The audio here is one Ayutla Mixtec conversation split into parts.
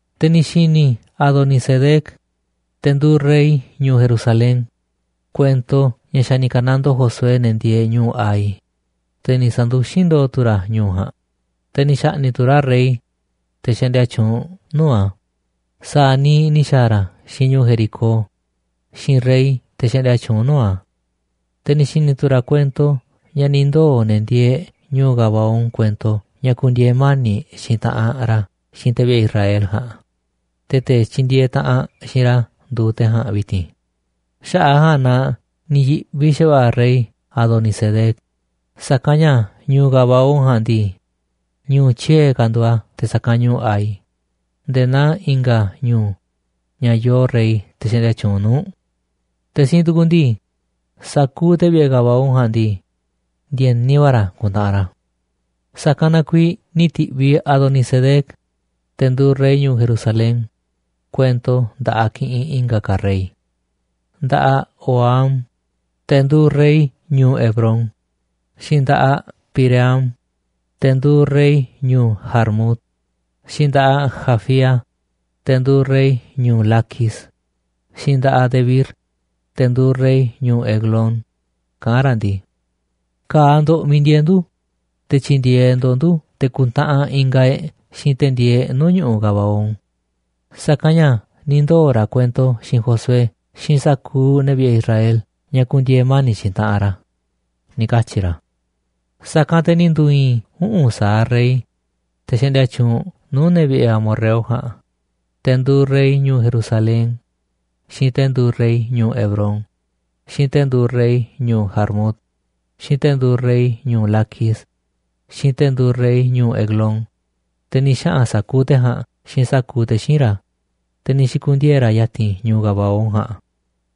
Te̱ ni̱ xi̱ni̱ Adonisedec, te̱ nduuꞌ rey ñu̱u̱ Jerusalén, kuento ña̱ xa̱ ni̱ ka̱nandoo Josué ne̱ ndieeꞌ ñu̱u̱ Hai, te̱ ni̱ sa̱nduxín ndo̱o̱ tu̱ ra̱ ñu̱u̱ ja̱a̱nꞌ, te̱ ni̱ xa̱ꞌni̱ꞌ tu̱ ra̱ rey, te̱ xaꞌndia tyuunꞌ nuu̱ꞌ a̱, sa̱a̱ niiꞌ ni̱ xa̱a̱ ra̱ xiinꞌ ñu̱u̱ Jericó, xiinꞌ rey, te̱ xaꞌndia tyuunꞌ nuu̱ꞌ a̱. Te̱ ni̱ xi̱ni̱ tu̱ ra̱ kuento ña̱ ni̱ ndoo̱ ne̱ ndieeꞌ ñu̱u̱ Gabaón kuento ña̱ ku̱ndi̱e̱e̱ mani̱ꞌ xiinꞌ taꞌanꞌ ra̱ xiinꞌ te̱ vi̱ꞌe̱ Israel ja̱a̱nꞌ, te̱ te̱ tyindieeꞌ taꞌanꞌ xiinꞌ ra̱ nduuꞌ te̱ ja̱a̱nꞌ vi̱ti̱n. Xaꞌa̱ꞌ a̱ ja̱a̱nꞌ na ni̱ yi̱ꞌvi xa̱va̱ꞌa̱ rey Adonisedec, sa̱kanꞌ ña̱ ñu̱u̱ Gabaón ja̱a̱nꞌ ndii, ñu̱u̱ tyiee̱ ka̱ nduuꞌ a̱ te̱ sa̱kanꞌ ñu̱u̱ Hai, nde̱e̱ naa i̱nga̱ ñu̱u̱, ña̱ yoo rey xaꞌndia tyuunꞌ nuu̱ꞌ. Te̱ siinꞌ tukuꞌ ndii, sa̱kuuꞌ te̱ vi̱ꞌe̱ Gabaón ja̱a̱nꞌ ndii, ndi̱e̱ni va̱ ra̱ ku̱ntaꞌanꞌ ra̱. Sa̱kanꞌ na kuiiꞌ ni̱ ti̱ꞌviꞌ Adonisedec, te̱ nduuꞌ rey ñu̱u̱ Jerusalén, kuento nda̱ꞌaꞌ kiꞌinꞌ i̱nga̱ ka̱ rey: nda̱ꞌaꞌ Hoham, te̱ nduuꞌ rey ñu̱u̱ Hebrón, xiinꞌ nda̱ꞌaꞌ Piream, te̱ nduuꞌ rey ñu̱u̱ Jarmut, xiinꞌ nda̱ꞌaꞌ Jafía, te̱ nduuꞌ rey ñu̱u̱ Laquis, xiinꞌ nda̱ꞌaꞌ Debir, te̱ nduuꞌ rey ñu̱u̱ Eglón, kaꞌán ra̱ ndii: ―Ka̱a̱ ndo̱ꞌ miiꞌ ndieeꞌ ndu̱, te̱ tyi̱ndi̱e̱eꞌ ndo̱ꞌ ndu̱ te̱ ku̱ntaꞌanꞌ ingaꞌ e̱ꞌ xiinꞌ te̱ ndieeꞌ nuu̱ꞌ ñu̱ꞌuꞌ Gabaón, sa̱kanꞌ ña̱ ni̱ ndoo̱ ra̱ kuento xiinꞌ Josué xiinꞌ sa̱kuuꞌ ne̱ vi̱ꞌe̱ Israel ña̱ ku̱ndi̱e̱e̱ mani̱ꞌ xiinꞌ taꞌanꞌ ra̱ ―ni̱ katyi̱ ra̱. Sa̱kanꞌ te̱ ni̱ ndu̱i̱i̱n uꞌu̱n sa̱aꞌ rey, te̱ xaꞌndia tyuunꞌ nuu̱ꞌ ne̱ vi̱ꞌe̱ amorreo ja̱a̱nꞌ, te̱ nduuꞌ rey ñu̱u̱ Jerusalén, xiinꞌ te̱ nduuꞌ rey ñu̱u̱ Hebrón, xiinꞌ te̱ nduuꞌ rey ñu̱u̱ Jarmut, xiinꞌ te̱ nduuꞌ rey ñu̱u̱ Laquis, xiinꞌ te̱ nduuꞌ rey ñu̱u̱ Eglón, te̱ ni̱ xaꞌa̱n sa̱kuuꞌ te̱ ja̱a̱nꞌ xiinꞌ sa̱kuuꞌ te̱ xíinꞌ ra̱, te̱ ni̱ xi̱ku̱ndiee̱ ra̱ ya̱ti̱n ñu̱u̱ Gabaón ja̱a̱nꞌ,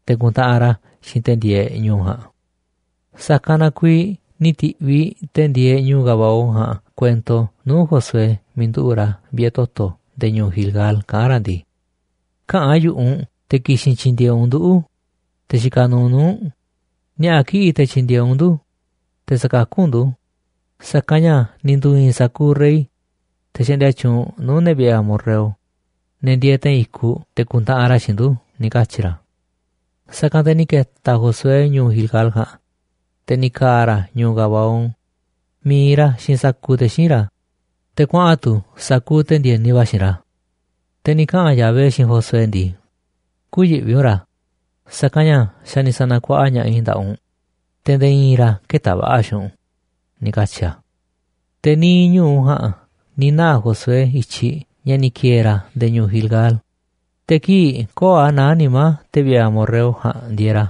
te̱ ku̱ntaꞌanꞌ ra̱ xiinꞌ te̱ ndieeꞌ ñu̱u̱ ja̱a̱nꞌ. Sa̱kanꞌ na kuiiꞌ ni̱ ti̱ꞌviꞌ te̱ ndieeꞌ ñu̱u̱ Gabaón ja̱a̱nꞌ kuento nuu̱ꞌ Josué miiꞌ nduꞌu̱ꞌ ra̱ vi̱ꞌe̱ toto̱ nde̱e̱ ñu̱u̱ Gilgal, kaꞌán ra̱ ndii: ―Käꞌa̱n yu̱ꞌuꞌ u̱nꞌ te̱ ki̱xi̱n tyi̱ndi̱e̱eꞌ u̱nꞌ nduꞌu̱, te̱ xikaꞌ nuuꞌ nuu̱ꞌ u̱nꞌ, ni̱a̱ꞌa̱ kiꞌi̱ꞌ te̱ tyi̱ndi̱e̱eꞌ u̱nꞌ ndu̱, te̱ sa̱kakú u̱nꞌ ndu̱, sa̱kanꞌ ña̱ ni̱ ndu̱i̱i̱n sa̱kuuꞌ rey, te̱ xaꞌndia tyuunꞌ nuu̱ꞌ ne̱ vi̱ꞌe̱ amorreo, ne̱ ndieeꞌ te̱i̱n i̱kuꞌ, te̱ ku̱ntaꞌanꞌ ra̱ xiinꞌ ndu̱ ―ni̱ katyi̱ ra̱. Sa̱kanꞌ te̱ ni̱ ke̱ta̱ Josué ñu̱u̱ Gilgal ja̱a̱nꞌ, te̱ ni̱ ka̱a̱ ra̱ ñu̱u̱ Gabaón, mi̱iꞌ ra̱ xiinꞌ sa̱kuuꞌ te̱ xíinꞌ ra̱, te̱ kuaꞌa̱n tu̱ sa̱kuuꞌ te̱ ndi̱e̱ni va̱ xiinꞌ ra̱. Te̱ ni̱ kaꞌa̱n Yahvé xiinꞌ Josué ndii: ―Kü̱yi̱ꞌvi u̱nꞌ ra̱, sa̱kanꞌ ña̱ xa̱ ni̱ sa̱na̱kuaꞌa ña̱ꞌaꞌ i̱ nda̱ꞌaꞌ u̱nꞌ, te̱ nde̱e̱ i̱i̱n ra̱ kë̱ta̱ va̱ꞌa̱ xiinꞌ u̱nꞌ ―ni̱ katyi̱ a̱. Te̱ niiꞌ ñu̱u ja̱a̱nꞌ ni̱ naa̱ Josué i̱tyiꞌ ña̱ ni̱ ki̱e̱e̱ ra̱ nde̱e̱ ñu̱u̱ Gilgal, te̱ kii̱ꞌ köo̱ꞌ a̱ naá nimá te̱ vi̱ꞌe̱ amorreo ja̱a̱nꞌ ndieeꞌ ra̱,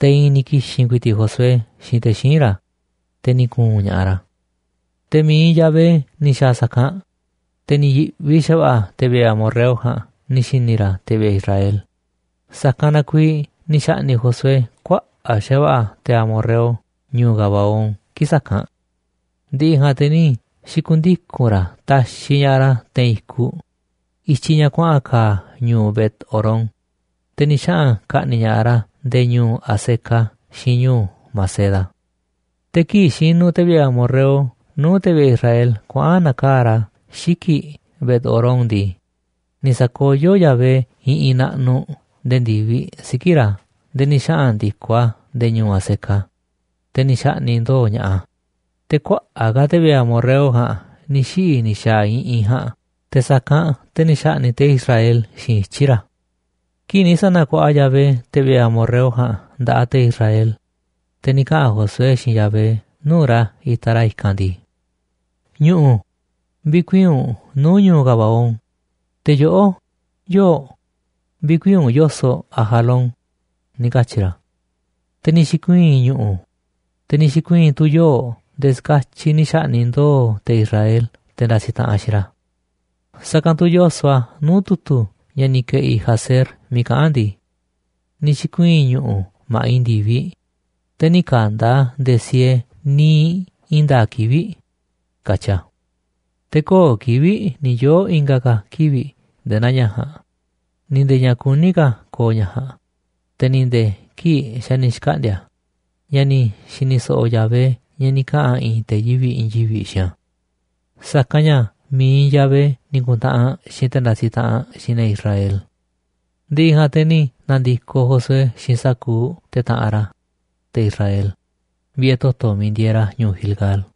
te̱ i̱i̱n ni̱ ki̱xi̱n ku̱i̱ti̱ꞌ Josué xiinꞌ te̱ xíinꞌ ra̱, te̱ ni̱ ku̱u̱n ña̱ꞌaꞌ ra̱. Te̱ mi̱iꞌ Yahvé ni̱ xa̱a̱ sa̱kanꞌ, te̱ ni̱ yi̱ꞌvi xa̱va̱ꞌa̱ te̱ vi̱ꞌe̱ amorreo ja̱a̱nꞌ ni̱ xi̱ni̱ ra̱ te̱ vi̱ꞌe̱ Israel, sa̱kanꞌ na kuiiꞌ ni̱ xa̱ꞌni̱ꞌ Josué kuaꞌa̱ꞌ xa̱va̱ꞌa̱ te̱ amorreo ñu̱u̱ Gabaón kii̱ꞌ sa̱kanꞌ. Ndi̱ꞌi̱ ja̱a̱nꞌ te̱ ni̱ xi̱ku̱ndiku̱n ra̱ taxiꞌ ña̱ꞌaꞌ ra̱ te̱i̱n i̱kuꞌ i̱tyiꞌ ña̱ kuaꞌa̱n ka̱a̱ ñu̱u̱ Bet-horón, te̱ ni̱ xaꞌa̱n ka̱ꞌni̱ꞌ ña̱ꞌaꞌ ra̱ nde̱e̱ ñu̱u̱ Azeca xiinꞌ ñu̱u̱ Maceda. Te̱ kii̱ꞌ xinuꞌ te̱ vi̱ꞌe̱ amorreo nuu̱ꞌ te̱ vi̱ꞌe̱ Israel kuaꞌa̱n na̱kaa̱ꞌ ra̱ xiki̱ꞌ Bet-horón ndii, ni̱ sa̱koyó Yahvé iꞌinꞌ naꞌnuꞌ nde̱e̱ ndi̱viꞌ siki̱ꞌ ra̱ nde̱e̱ ni̱ xaꞌa̱n ndi̱koꞌ a̱ nde̱e̱ ñu̱u̱ Azeca, te̱ ni̱ xa̱ꞌni̱ꞌ ndo̱o̱ ña̱ꞌaꞌ a̱. Te̱ kuaꞌa̱ꞌ ka̱ te̱ vi̱ꞌe̱ amorreo ja̱a̱nꞌ ni̱ xiꞌi̱ ni̱ xa̱a̱ iꞌinꞌ ja̱a̱nꞌ te̱ sa̱kanꞌ te̱ ni̱ xa̱ꞌni̱ꞌ te̱ Israel xiinꞌ ityi̱ ra̱. Kii̱ꞌ ni̱ sa̱na̱kuaꞌa Yahvé te̱ vi̱ꞌe̱ amorreo ja̱a̱nꞌ nda̱ꞌaꞌ te̱ Israel, te̱ ni̱ kaꞌa̱n Josué xiinꞌ Yahvé nuu̱ꞌ ra̱ itaꞌ ra̱ i̱kanꞌ ndii: ―Ñu̱ꞌu̱, vi̱kuii̱n u̱nꞌ nuu̱ꞌ ñu̱u̱ Gabaón, te̱ yoꞌó, yoo̱ꞌ, vi̱kuii̱n u̱nꞌ yo̱soꞌ Ajalón ―ni̱ katyi̱ ra̱. Te̱ ni̱ xi̱kuii̱n ñu̱ꞌu̱, te̱ ni̱ xi̱kuii̱n tu̱ yoo̱ꞌ nde̱e̱ ska̱tyiꞌ ni̱ xa̱ꞌni̱ꞌ ndo̱o̱ te̱ Israel te̱ ndasiꞌ taꞌanꞌ xiinꞌ ra̱. Sa̱kanꞌ tu̱ yoso̱ꞌ a̱ nuu̱ꞌ tu̱tu̱ ña̱ ni̱ ke̱ꞌi̱ Jaser miiꞌ kaꞌán a̱ ndii: “Ni̱ xi̱kuii̱n ñu̱ꞌu̱ ma̱ꞌiꞌ ndi̱viꞌ, te̱ nï̱ ka̱nda̱ a̱ ndee siee niiꞌ i̱i̱n nda̱a̱ꞌ kivi̱ꞌ”, katyi a̱. Te̱ köo̱ꞌ kivi̱ꞌ ni̱ yoo̱ i̱nga̱ ka̱ kivi̱ꞌ nde̱e̱ naa ña̱ ja̱a̱nꞌ, ni̱ nde̱e̱ ña̱ kuní ka̱ ko̱o̱ ña̱ ja̱a̱nꞌ, te̱ ni̱ nde̱e̱ kii̱ꞌ xa̱ ni̱ xkaꞌndi̱a̱ a̱, ña̱ ni̱ xi̱ni̱ so̱ꞌo̱ Yahvé ña̱ ni̱ kaꞌa̱n i̱i̱n te̱ yivi̱ꞌ i̱i̱n yivi̱ꞌ xiinꞌ a̱. Sa̱kanꞌ ña̱ mi̱iꞌ Yahvé ni̱ ku̱ntaꞌanꞌ xiinꞌ te̱ ndasiꞌ taꞌanꞌ xiinꞌ ne̱ Israel. Ndi̱ꞌi̱ ja̱a̱nꞌ te̱ ni̱ na̱ndi̱koꞌ Josué xiinꞌ sa̱kuuꞌ te̱ taꞌanꞌ ra̱, te̱ Israel, vi̱ꞌe̱ toto̱ miiꞌ ndieeꞌ ra̱ ñu̱u̱ Gilgal.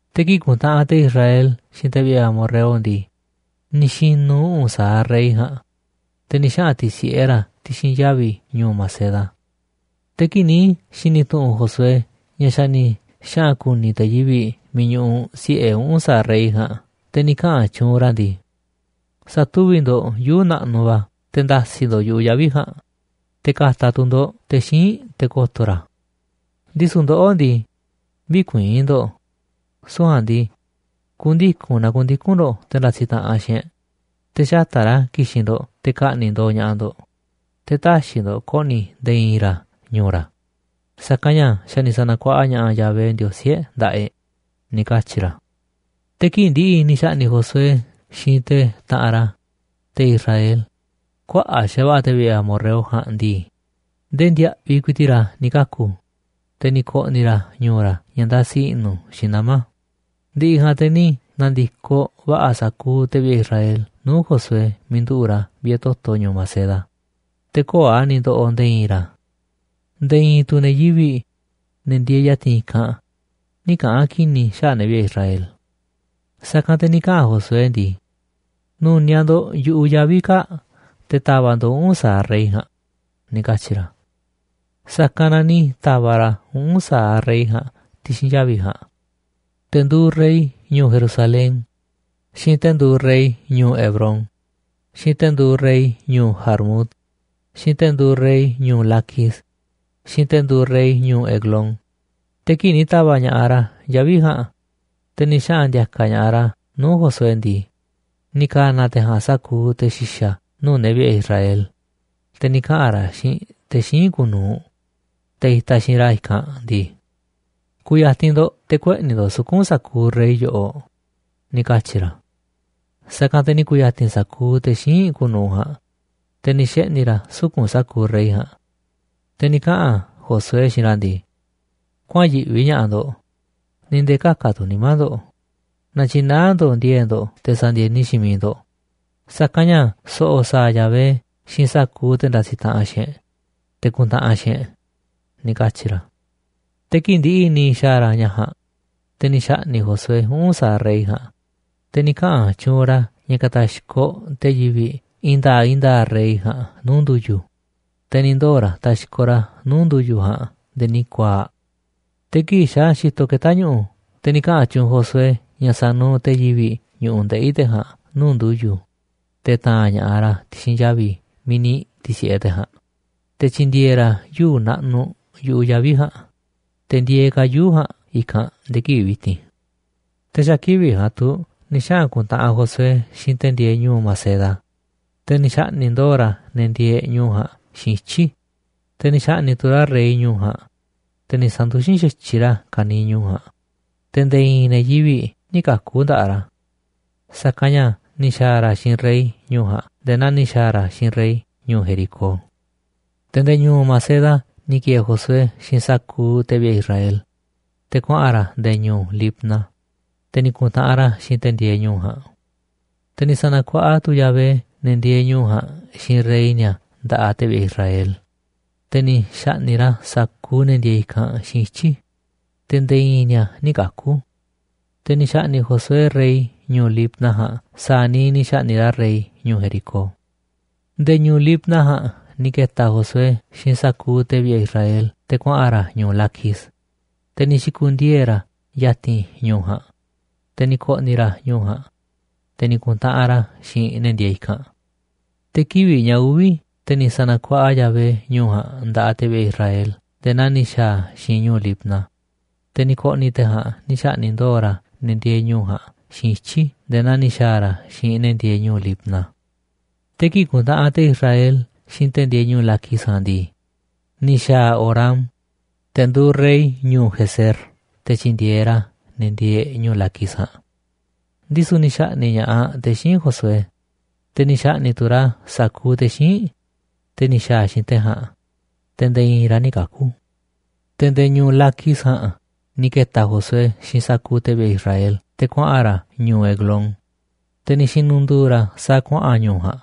Te̱ kii̱ꞌ kuntaꞌanꞌ te̱ Israel xiinꞌ te̱ vi̱ꞌe̱ amorreo ndii, ni̱ xi̱nu̱ uꞌu̱n sa̱aꞌ rey ja̱a̱nꞌ, te̱ ni̱ xaꞌa̱n ti̱si̱ꞌe ra̱ ti̱xi̱n yavi̱ ñu̱u̱ Maceda. Te̱ kii̱ꞌ ni̱ xi̱ni̱ tu̱ꞌu̱n Josué ña̱ xa̱ ni̱ xaꞌa̱n ku̱ni̱ te̱ yivi̱ꞌ miiꞌ ñuꞌuꞌ si̱ꞌe uꞌu̱n sa̱aꞌ rey ja̱a̱nꞌ, ni̱ kaꞌa̱n tyuunꞌ ra̱ ndii: ―Sa̱tuvi̱ꞌ ndo̱ꞌ yuu̱ꞌ naꞌnuꞌ va̱ te̱ nda̱si̱ ndo̱ꞌ yu̱ꞌuꞌ yavi̱ ja̱a̱nꞌ, te̱ ka̱ta̱ tu̱ ndo̱ꞌ te̱ xíinꞌ te̱ ko̱to̱ ra̱ a̱. Ndisu̱ ndoꞌó ndii, vï̱kuii̱n ndo̱ꞌ, süu̱ꞌ ja̱a̱nꞌ ndii, ku̱ndiku̱n naa ku̱ndiku̱n ndo̱ꞌ te̱ ndasiꞌ taꞌanꞌ xiinꞌ e̱ꞌ, te̱ xata̱ꞌ ra̱ ki̱xi̱n ndo̱ꞌ te̱ ka̱ꞌni̱ꞌ ndo̱o̱ ña̱ꞌaꞌ ndo̱ꞌ. Te̱ tä̱xi̱ ndo̱ꞌ ko̱ꞌni̱ nde̱e̱ i̱i̱n ra̱ ñu̱u̱ ra̱, sa̱kanꞌ ña̱ xa̱ ni̱ sa̱na̱kuaꞌa ña̱ꞌaꞌ Yahvé Ndiosí e̱ꞌ nda̱ꞌaꞌ e̱ꞌ ―ni̱ katyi̱ ra̱. Te̱ kii̱ꞌ ndi̱ꞌi̱ ni̱ xa̱ꞌni̱ꞌ Josué xiinꞌ te̱ taꞌanꞌ ra̱, te̱ Israel, kuaꞌa̱ꞌ xa̱va̱ꞌa̱ te̱ vi̱ꞌe̱ amorreo ja̱a̱nꞌ ndii, ndee ndiaꞌviꞌ ku̱i̱ti̱ꞌ ra̱ ni̱ kaku̱, te̱ ni̱ ko̱ꞌni̱ ra̱ ñu̱u̱ ra̱ ña̱ ndasi i̱ꞌnu̱ xiinꞌ nama̱. Ndi̱ꞌi̱ ja̱a̱nꞌ te̱ ni̱ na̱ndi̱koꞌ va̱ꞌa̱ sa̱kuuꞌ te̱ vi̱ꞌe̱ Israel nuu̱ꞌ Josué miiꞌ nduꞌu̱ꞌ ra̱ vi̱ꞌe̱ toto̱ ñu̱u̱ Maceda, te̱ köo̱ꞌ a̱ ni̱ ndoꞌoꞌ nde̱e̱ i̱i̱n ra̱. Nde̱e̱ i̱i̱n tu̱ ne̱ yivi̱ꞌ, ne̱ ndieeꞌ ya̱ti̱n i̱kanꞌ, nï̱ kaꞌa̱n ki̱ni̱ xaꞌa̱ꞌ ne̱ vi̱ꞌe̱ Israel. Sa̱kanꞌ te̱ ni̱ kaꞌa̱n Josué ndii: ―Nu̱niaꞌ ndo̱ꞌ yu̱ꞌuꞌ yavi̱ kaa̱ꞌ te̱ ta̱va̱ꞌ ndo̱ꞌ uꞌu̱n sa̱aꞌ rey ja̱a̱nꞌ ―ni̱ katyi̱ ra̱. Sa̱kanꞌ na ni̱ ta̱va̱ꞌ ra̱ uꞌu̱n sa̱aꞌ rey ja̱a̱nꞌ ti̱xi̱n yavi̱ ja̱a̱nꞌ, te̱ nduuꞌ rey ñu̱u̱ Jerusalén, xiinꞌ te̱ nduuꞌ rey ñu̱u̱ Hebrón, xiinꞌ te̱ nduuꞌ rey ñu̱u̱ Jarmut, xiinꞌ te̱ nduuꞌ rey ñu̱u̱ Laquis, xiinꞌ te̱ nduuꞌ rey ñu̱u̱ Eglón. Te̱ kii̱ꞌ ni̱ ta̱va̱ꞌ ña̱ꞌaꞌ ra̱ yavi̱ ja̱a̱nꞌ, te̱ ni̱ xaꞌa̱n ndi̱a̱ka̱ ña̱ꞌaꞌ ra̱ nuu̱ꞌ Josué ndii, ni̱ ka̱na̱ te̱ ja̱a̱nꞌ sa̱kuuꞌ te̱ xi̱xa̱ nuu̱ꞌ ne̱ vi̱ꞌe̱ Israel, te̱ ni̱ kaꞌa̱n ra̱ xiinꞌ te̱ xíinꞌ kuuꞌ nu̱uꞌ, te̱ itaꞌ xiinꞌ ra̱ i̱kanꞌ ndii: ―Ku̱ya̱ti̱n ndo̱ꞌ te̱ kueꞌni̱ ndo̱ꞌ suku̱nꞌ sa̱kuuꞌ rey yoꞌoꞌ ―ni̱ katyi̱ ra̱. Sa̱kanꞌ te̱ ni̱ ku̱ya̱ti̱n sa̱kuuꞌ te̱ xíinꞌ kuuꞌ nu̱uꞌ ja̱a̱nꞌ, te̱ ni̱ xeꞌni̱ ra̱ suku̱nꞌ sa̱kuuꞌ rey ja̱a̱nꞌ. Te̱ ni̱ kaꞌa̱n Josué xiinꞌ ra̱ ndii: ―Kuäa̱nꞌ yiꞌvi ña̱ꞌaꞌ ndo̱ꞌ, ni̱ nde̱e̱ ka̱ka̱ tu̱ nimá ndo̱ꞌ, na̱tyi̱naá ndo̱ꞌ ndi̱e̱e̱ꞌ ndo̱ꞌ te̱ sa̱ndi̱e̱ni xiinꞌ miiꞌ ndo̱ꞌ, sa̱kanꞌ ña̱ so̱ꞌo̱ sa̱a̱ Yahvé xiinꞌ sa̱kuuꞌ te̱ ndasiꞌ taꞌanꞌ xiinꞌ e̱ꞌ, te̱ ku̱ntaꞌanꞌ xiinꞌ e̱ꞌ ―ni̱ katyi̱ ra̱. Te̱ kii̱ꞌ ndi̱ꞌi̱ ni̱ xa̱a̱ ra̱ ña̱ ja̱a̱nꞌ, te̱ ni̱ xa̱ꞌni̱ꞌ Josué uꞌu̱n sa̱aꞌ rey ja̱a̱nꞌ, te̱ ni̱ kaꞌa̱n tyuunꞌ ra̱ ña̱ ka̱ta̱xkoꞌ te̱ yivi̱ꞌ i̱i̱n nda̱a̱ꞌ i̱i̱n nda̱a̱ꞌ rey ja̱a̱nꞌ nuu̱ꞌ ndu̱yu̱, te̱ ni̱ ndoo̱ ra̱ taxkoꞌ ra̱ nuu̱ꞌ ndu̱yu̱ ja̱a̱nꞌ nde̱e̱ ni̱ ku̱a̱a̱ꞌ. Te̱ kii̱ꞌ xa̱ xitoꞌ keta̱ ñu̱ꞌu̱, te̱ ni̱ kaꞌa̱n tyuunꞌ Josué ña̱ sa̱nuuꞌ te̱ yivi̱ꞌ ñu̱ꞌuꞌ ndeꞌi̱ te̱ ja̱a̱nꞌ nuu̱ꞌ ndu̱yu̱, te̱ ta̱a̱n ña̱ꞌaꞌ ra̱ ti̱xi̱n yavi̱ miiꞌ ni̱ ti̱si̱ꞌe te̱ ja̱a̱nꞌ, te̱ ta̱ndi̱e̱e̱ ra̱ yuu̱ꞌ naꞌnuꞌ yu̱ꞌuꞌ yavi̱ ja̱a̱nꞌ, te̱ ndieeꞌ ka̱ yuu̱ꞌ ja̱a̱nꞌ i̱kanꞌ nde̱e̱ kivi̱ꞌ vi̱ti̱n. Te̱ xa̱ kivi̱ꞌ ja̱a̱nꞌ tu̱ ni̱ xaꞌa̱n ku̱ntaꞌanꞌ Josué xiinꞌ te̱ ndieeꞌ ñu̱u̱ Maceda, te̱ ni̱ xa̱ꞌni̱ꞌ ndo̱o̱ ra̱ ne̱ ndieeꞌ ñu̱u̱ ja̱a̱nꞌ xiinꞌ ityi̱. Te̱ ni̱ xa̱ꞌni̱ꞌ tu̱ ra̱ rey ñu̱u̱ ja̱a̱nꞌ, te̱ ni̱ sa̱nduxín xa̱tyiꞌ ra̱ ka̱niiꞌ ñu̱u̱ ja̱a̱nꞌ, te̱ nde̱e̱ i̱i̱n ne̱ yivi̱ꞌ nï̱ kaku̱ nda̱ꞌaꞌ ra̱. Sa̱kanꞌ ña̱ ni̱ xa̱a̱ ra̱ xiinꞌ rey ñu̱u̱ ja̱a̱nꞌ nde̱e̱ naa ni̱ xa̱a̱ ra̱ xiinꞌ rey ñu̱u̱ Jericó. Te̱ nde̱e̱ ñu̱u̱ Maceda ni̱ ki̱e̱e̱ Josué xiinꞌ sa̱kuuꞌ te̱ vi̱ꞌe̱ Israel, te̱ kuaꞌa̱n ra̱ nde̱e̱ ñu̱u̱ Libna, te̱ ni̱ ku̱ntaꞌanꞌ ra̱ xiinꞌ te̱ ndieeꞌ ñu̱u̱ ja̱a̱nꞌ. Te̱ ni̱ sa̱na̱kuaꞌa tu̱ Yahvé ne̱ ndieeꞌ ñu̱u̱ ja̱a̱nꞌ xiinꞌ rey ni̱a̱ nda̱ꞌaꞌ te̱ vi̱ꞌe̱ Israel, te̱ ni̱ xa̱ꞌni̱ꞌ ra̱ sa̱kuuꞌ ne̱ ndieeꞌ i̱kanꞌ xiinꞌ ityi̱, te̱ nde̱e̱ i̱i̱n ni̱a̱ nï̱ kaku̱. Te̱ ni̱ xa̱ꞌni̱ꞌ Josué rey ñu̱u̱ Libna ja̱a̱nꞌ sa̱a̱ niiꞌ ni̱ xa̱ꞌni̱ꞌ ra̱ rey ñu̱u̱ Jericó. Nde̱e̱ ñu̱u̱ Libna ja̱a̱nꞌ ni̱ ke̱ta̱ Josué xiinꞌ sa̱kuuꞌ te̱ vi̱ꞌe̱ Israel te̱ kuaꞌa̱n ra̱ ñu̱u̱ Laquis, te̱ ni̱ xi̱ku̱ndiee̱ ra̱ ya̱ti̱n ñu̱u̱ ja̱a̱nꞌ, te̱ ni̱ ko̱ꞌni̱ ra̱ ñu̱u̱ ja̱a̱nꞌ, te̱ ni̱ ku̱ntaꞌanꞌ ra̱ xiinꞌ ne̱ ndieeꞌ i̱kanꞌ. Te̱ kivi̱ꞌ ña̱ uvi̱, te̱ ni̱ sa̱na̱kuaꞌa Yahvé ñu̱u̱ ja̱a̱nꞌ nda̱ꞌaꞌ te̱ vi̱ꞌe̱ Israel nde̱e̱ naa ni̱ xa̱a̱ a̱ xiinꞌ ñu̱u̱ Laquis, te̱ ni̱ ko̱ꞌni̱ te̱ ja̱a̱nꞌ ni̱ xa̱ꞌni̱ꞌ ndo̱o̱ ra̱ ne̱ ndieeꞌ ñu̱u̱ ja̱a̱nꞌ xiinꞌ ityi̱ nde̱e̱ naa ni̱ xa̱a̱ ra̱ xiinꞌ ne̱ ndieeꞌ ñu̱u̱ Libna. Te̱ kii̱ꞌ kuntaꞌanꞌ te̱ Israel xiinꞌ te̱ ndieeꞌ ñu̱u̱ Laquis ja̱a̱nꞌ ndii, ni̱ xa̱a̱ Horam, te̱ nduuꞌ rey ñu̱u̱ Gezer te̱ tyi̱ndi̱e̱eꞌ ra̱ ne̱ ndieeꞌ ñu̱u̱ Laquis ja̱a̱nꞌ. Ndisu̱ ni̱ xa̱ꞌni̱ꞌ ña̱ꞌaꞌ te̱ xíinꞌ Josué, te̱ ni̱ xa̱ꞌni̱ꞌ tu̱ ra̱ sa̱kuuꞌ te̱ xíinꞌ, te̱ ni̱ xa̱a̱ xiinꞌ te̱ ja̱a̱nꞌ, te̱ nde̱e̱ i̱i̱n ra̱ nï̱ kaku̱. Te̱ nde̱e̱ ñu̱u̱ Laquis ja̱a̱nꞌ ni̱ ke̱ta̱ Josué xiinꞌ sa̱kuuꞌ te̱ vi̱ꞌe̱ Israel te̱ kuaꞌa̱n ra̱ ñu̱u̱ Eglón, te̱ ni̱ xi̱nu̱ndu̱u̱ ra̱ sa̱a̱ kuaꞌa̱n ñu̱u̱ ja̱a̱nꞌ,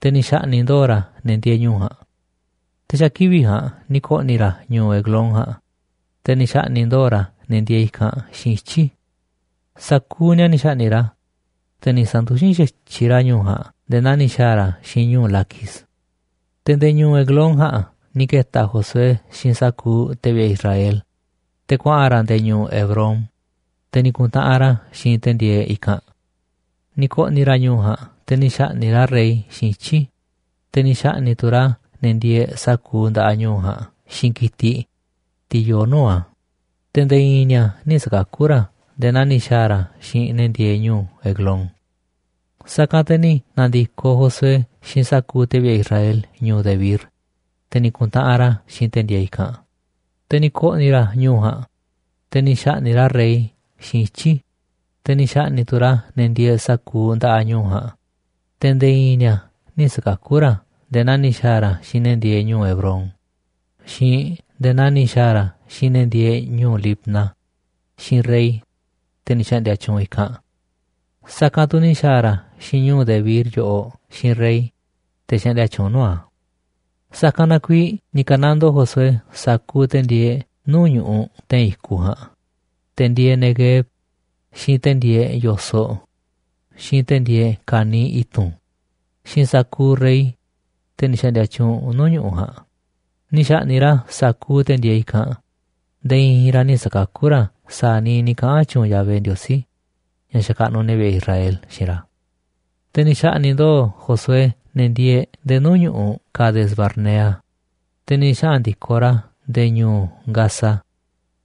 te̱ ni̱ xa̱ꞌni̱ꞌ ndo̱o̱ ra̱ ne̱ ndieeꞌ ñu̱u̱ ja̱a̱nꞌ. Te̱ xa̱ kivi̱ꞌ ja̱a̱nꞌ ni̱ ko̱ꞌni̱ ra̱ ñu̱u̱ Eglón ja̱a̱nꞌ, te̱ ni̱ xa̱ꞌni̱ꞌ ndo̱o̱ ra̱ ne̱ ndieeꞌ i̱kanꞌ xiinꞌ ityi̱. Sa̱kuuꞌ ni̱a̱ ni̱ xa̱ꞌni̱ꞌ ra̱, te̱ ni̱ sa̱nduxín xa̱tyiꞌ ra̱ ñu̱u̱ ja̱a̱nꞌ nde̱e̱ naa ni̱ xa̱a̱ ra̱ xiinꞌ ñu̱u̱ Laquis. Te̱ nde̱e̱ ñu̱u̱ Eglón ja̱a̱nꞌ ni̱ ke̱ta̱ Josué xiinꞌ sa̱kuuꞌ te̱ vi̱ꞌe̱ Israel, te̱ kuaꞌa̱n ra̱ nde̱e̱ ñu̱u̱ Hebrón, te̱ ni̱ ku̱ntaꞌanꞌ ra̱ xiinꞌ te̱ ndieeꞌ i̱kanꞌ. Ni̱ ko̱ꞌni̱ ra̱ ñu̱u̱ ja̱a̱nꞌ te̱ ni̱ xa̱ꞌni̱ꞌ ra̱ rey xiinꞌ ityi̱, te̱ ni̱ xa̱ꞌni̱ꞌ tu̱ ra̱ ne̱ ndieeꞌ sa̱kuuꞌ nda̱ꞌaꞌ ñu̱u̱ ja̱a̱nꞌ xiinꞌ ki̱tiꞌ, tiꞌ yoo nuu̱ꞌ a̱, te̱ nde̱e̱ i̱i̱n ni̱a̱ nï̱ sa̱kakú ra̱ nde̱e̱ naa ni̱ xa̱a̱ ra̱ xiinꞌ ne̱ ndieeꞌ ñu̱u̱ Eglón. Sa̱kanꞌ te̱ ni̱ na̱ndi̱koꞌ Josué xiinꞌ sa̱kuuꞌ te̱ vi̱ꞌe̱ Israel ñu̱u̱ Debir, te̱ ni̱ ku̱ntaꞌanꞌ ra̱ xiinꞌ te̱ ndieeꞌ i̱kanꞌ. Te̱ ni̱ ko̱ꞌni̱ ra̱ ñu̱u̱ ja̱a̱nꞌ, te̱ ni̱ xa̱ꞌni̱ꞌ ra̱ rey xiinꞌ ityi̱, te̱ ni̱ xa̱ꞌni̱ꞌ tu̱ ra̱ ne̱ ndieeꞌ sa̱kuuꞌ nda̱ꞌaꞌ ñu̱u̱ ja̱a̱nꞌ, te̱ nde̱e̱ i̱i̱n ni̱a̱ nï̱ sa̱kakú ra̱ nde̱e̱ naa ni̱ xa̱a̱ ra̱ xiinꞌ ne̱ ndieeꞌ ñu̱u̱ Hebrón, xiinꞌ nde̱e̱ naa ni̱ xa̱a̱ ra̱ xiinꞌ ne̱ ndieeꞌ ñu̱u̱ Libna, xiinꞌ rey, te̱ ni̱ xa̱ꞌndi̱a̱ tyuunꞌ i̱kanꞌ. Sa̱kanꞌ tu̱ ni̱ xa̱a̱ ra̱ xiinꞌ ñu̱u̱ Debir yoꞌoꞌ xiinꞌ rey, te̱ xaꞌndia tyuunꞌ nuu̱ꞌ a̱. Sa̱kanꞌ na kuiiꞌ ni̱ ka̱nandoo Josué sa̱kuuꞌ te̱ ndieeꞌ nuu̱ꞌ ñu̱ꞌuꞌ te̱i̱n i̱kuꞌ ja̱a̱nꞌ, te̱ ndieeꞌ Neguev, xiinꞌ te̱ ndieeꞌ yo̱soꞌ, xiinꞌ te̱ ndieeꞌ ka̱niiꞌ i̱tu̱n, xiinꞌ sa̱kuuꞌ rey, te̱ ni̱ xa̱ꞌndi̱a̱ tyuunꞌ nuu̱ꞌ ñu̱ꞌuꞌ ja̱a̱nꞌ, ni̱ xa̱ꞌni̱ꞌ ra̱ sa̱kuuꞌ te̱ ndieeꞌ i̱kanꞌ, nde̱e̱ i̱i̱n ra̱ nï̱ sa̱kakú ra̱ sa̱a̱ niiꞌ ni̱ kaꞌa̱n tyuunꞌ Yahvé, Ndiosí ña̱ xakaꞌnuꞌ ne̱ vi̱ꞌe̱ Israel, xiinꞌ ra̱. Te̱ ni̱ xa̱ꞌni̱ꞌ ndo̱o̱ Josué ne̱ ndieeꞌ nde̱e̱ nuu̱ꞌ ñu̱ꞌuꞌ Cades-barnea, te̱ ni̱ xaꞌa̱n ndi̱koꞌ ra̱ nde̱e̱ ñu̱u̱ Gaza,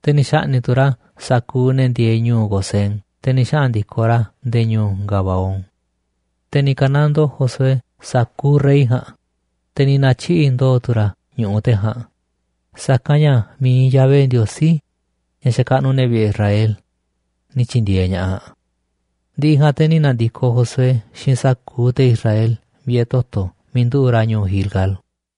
te̱ ni̱ xa̱ꞌni̱ꞌ tu̱ ra̱ sa̱kuuꞌ ne̱ ndieeꞌ ñu̱u̱ Gosén, te̱ ni̱ xaꞌa̱n ndi̱koꞌ ra̱ nde̱e̱ ñu̱u̱ Gabaón. Te̱ ni̱ ka̱nandoo Josué sa̱kuuꞌ rey ja̱a̱nꞌ, te̱ ni̱ na̱tyiꞌi̱ꞌ ndo̱o̱ tu̱ ra̱ ñu̱ꞌuꞌ te̱ ja̱a̱nꞌ, sa̱kanꞌ ña̱ mi̱iꞌ Yahvé, Ndiosí ña̱ xakaꞌnuꞌ ne̱ vi̱ꞌe̱ Israel, ni̱ tyi̱ndi̱e̱eꞌ ña̱ꞌaꞌ. Ndi̱ꞌi̱ ja̱a̱nꞌ te̱ ni̱ na̱ndi̱koꞌ Josué xiinꞌ sa̱kuuꞌ te̱ Israel vi̱ꞌe̱ toto̱ miiꞌ nduꞌu̱ꞌ ra̱ ñu̱u̱ Gilgal.